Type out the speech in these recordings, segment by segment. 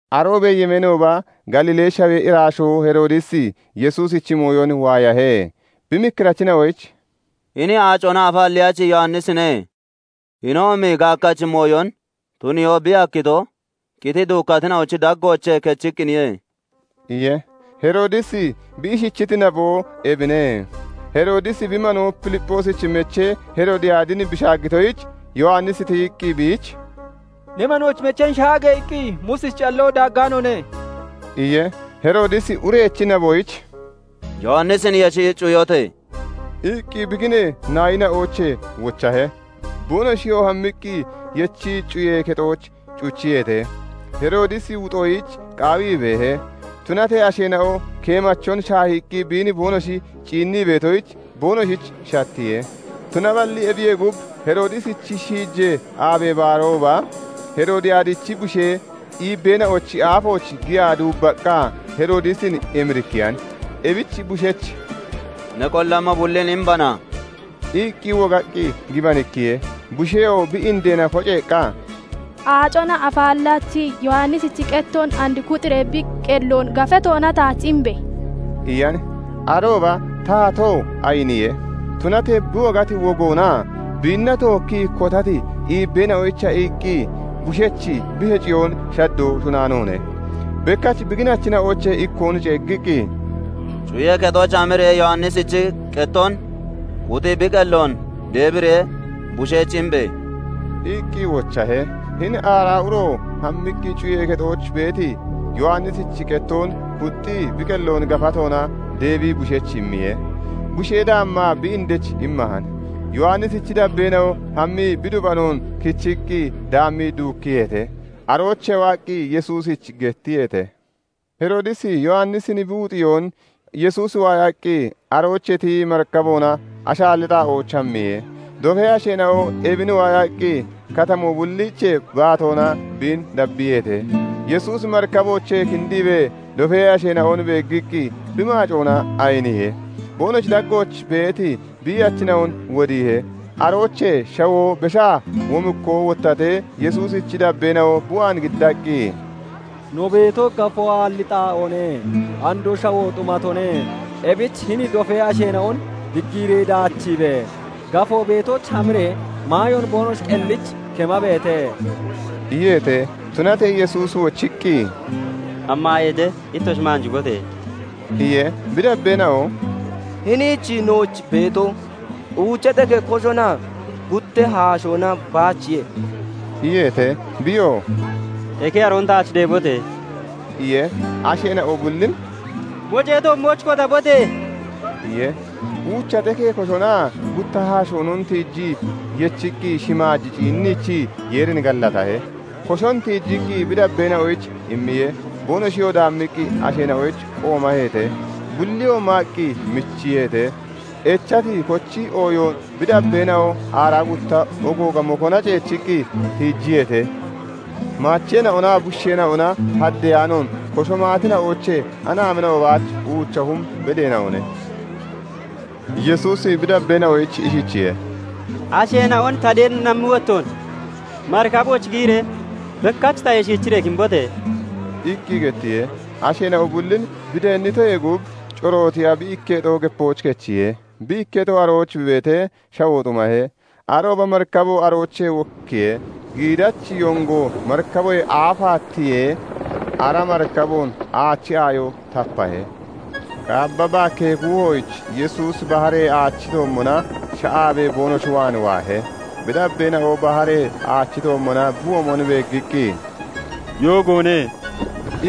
Aroobee yemeenooba Galiilee shawee iraashoo Heroodisi Yesuusichi mooyon waayahe. Bi mikkirachina'oyich "Hini Aacona Afaallachi Yowannisine. Hinoomi gaakkachi mooyon tuniyoo bi hakkito, qitii duukkatina'ochi daggoochee kechiqqiniye" iye. Heroodisi bi ishichiti naboo ebine; Heroodisi bi manoo Filipphoosich mechee Heroodiyaadin bi shaaggitoyich, Yowannisi tiyiqqi biich 'Ne manoochi mecheen shaage!' iqqi Muusichi calloo daaggaanoone" iye. Heroodisi urechi naboyich "Yowannisin yeshi cuyote!" iqqi bi ginee naayina'oochee wochahe. Boonoshiyoo hammiqqi yechii cuyee kexooch cuchiyeete. Heroodisi wuxxiyoyich qaawii beehe; tunatee asheena'o keemachon shaahiiqqi biin boonoshi ciinnii beetoyich boonoshich shattiye. Tunaballi ebiyee gub, Heroodisichi shiijee aabee baarooba Heroodiyaadichi bushee iibbeena'ochi aafooch giyaa duubbaqqa Heroodisin emirikkiyan. Ebich bushech "Ne qollammo bullin imbana" iqqi wogaqqi gibanikkiye. Busheyoo bi indeena koceeqqa, "Aacona Afaallachi Yowannisichi qettoon and kuxxiiree bi qelloon gafatoona taach imbe!" iyan. Arooba taatoo ayiniye; tunatee bi wogati wogoonaa biinna tookkii kotati iibbeena'onoyicha iqqi bushech bi heciyoon shaddoo shunnaanoone. Bekkach bi ginachina'oochee ikkoon ceeggiqqi, "Cuyee kexooch hamiree Yowannisichi qettoon kuxi bi qelloon deebiree bushech imbe!" iqqi wochahe. Hini ara uro hammiqqi cuyee kexooch beeti Yowannisichi qettoon kuxxii, Bi qelloon gafatoona deebii bushech immiye. Bushee daammaa bi indech immahan. Yowannisichi dabbeena'o hammii bi dubanoon kichiqqi daammii duukkiyeete; aroochee waaqqi Yesuusich gettiyeete. Heroodisi Yowannisin bi wuxiyoon Yesuusi waayaqqi aroochee tiyii marikaboona ashaalli xaa'ooch hammiye. Dofee asheena'o ebin waayaqqi katamoo bulliichee baatoona biin dabbiyeete. Yesuusi marikaboochee kindiibee dofee asheena'on beeggiqqi bi maacoona ayiniye. Boonoshi daggooch beeti biiyachina'on wodiihe. Aroochee shawoo beshaa womikkoo wottatee, Yesuusichi dabbeena'o bi waan giddaqqi, "No beeto gafoo aalli xaa'oone; andoo shawoo xumatone. Ebich hini dofee asheena'on diggiiree daachiibe! Gafoo beetooch hamiree maayoon boonoshi qellich kemabeete" iyeete. Tunatee Yesuusi wochiqqi, "Hammaayeete; ittoshi maanjibote!" iye. Bi dabbeena'oo "Hiniich nooch beeto uucha xekee koshonaa gutta haashoona baachiye" iyeete. Biyoo "Eke aroon taach deebote!" iye. Asheena'o bullin "Mocee toommooch kotabote!" iye. Uucha xekee koshonaa gutta haashoonon tiijii yechiqqi, shimaaj ciinniichii Yeerin gallatahe. Koshon tiichiqqi bi dabbeena'oyich immiye. Boonoshiyoo daammiqqi asheena'oyich qoomaheete. Bulliyoo maaqqi michiyeete. Echati kochi ooyoon bi dabbeena'o aaraa gutta ogooga mokoona ceechiqqi tiijiyeete. Maacheena'onaa bushiisheena'ona haddiyaanoon koshon maatina'oochee anaamina'o baach uucha hum bedeena'one. Yesuusi bi dabbeena'oyich ishichiye:- "Asheena'on ta deennammi wottoon marikabooch giyiree bekkach tayee shiichiree kimbote!" iqqi gettiye. Asheena'o bullin bi deennitoyee gub, corootiya bi ikketo gepooch kechiye. Bi ikketo arooch bi beetee, shawoo xumahe. Arooba marikabo aroochee wokkiye; giidachi yongo marikaboyee aafaa tiyee, ara marikaboon aachi aayo tapahe. Qaabba baakkee kuuhooch Yesuusi baharee aachi toommona sha'aabee boonoshi waan waahe. Bi dabbeena'o baharee aachi toommona bi womon beeggiqqi, "Yoogoone"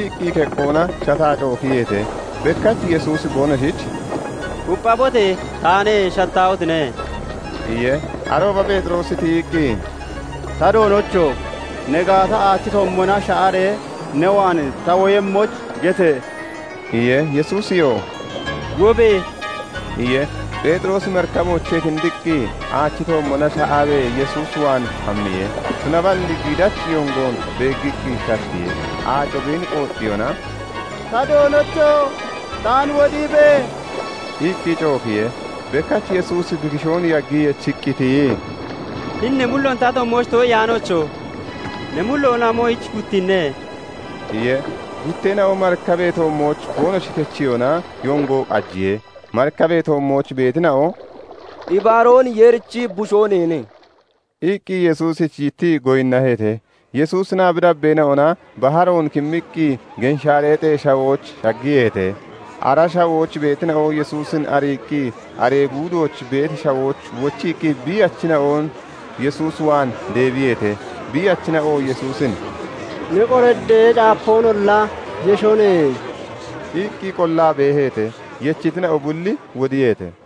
iqqi keqqoona shataa cookiyeete. Bekkach Yesuusi boonoshich "Kupphabote! Taane; shattaahotine!" iye. Arooba Pheexiroosi tiyiqqi, "Ta Doonocho! Ne gaata, aachi toommona sha'aree ne waan ta woyemmoyich gete!" iye. Yesuusiyoo "Wobe!" iye. Pheexiroosi marikaboochee kindiqqi aachi toommona sha'aabee Yesuus waan hammiye. Tunaballi giidachi yongoon beeggiqqi shattiye; aaco biin qooxxiyona, "Ta Doonocho! Taan wodiibe!" iqqi cookiye. Bekkach Yesuusi bi kishoon yaggii yechiqqi tiyii, "Hini ne mulloon ta toommooch too'iyaanoocho! Ne mulloon amoyich guttiine?" iye. Gutteena'oo marikabee toommooch boonoshi kechiyona yongo qajiye. Marikabee toommooch beetina'o "Ibaroon Yeerichi Bushoo neene" iqqi Yesuusich yittii goyinnaheete. Yesuusinaa bi dabbeena'ona baharoon kimmiqqi Genshaareexee Shawooch shaggiyeete. Ara shawooch beetina'o Yesuusin ariiqqi aree guudooch beeti shawooch wochiiqqi biiyachina'on Yesuus waan deebiyeete; Biiyachina'o Yesuusin "Ne qoraddee caapoonolla yeshone" iqqi qollaa beeheete. Yechitina'o bulli wodiyeete.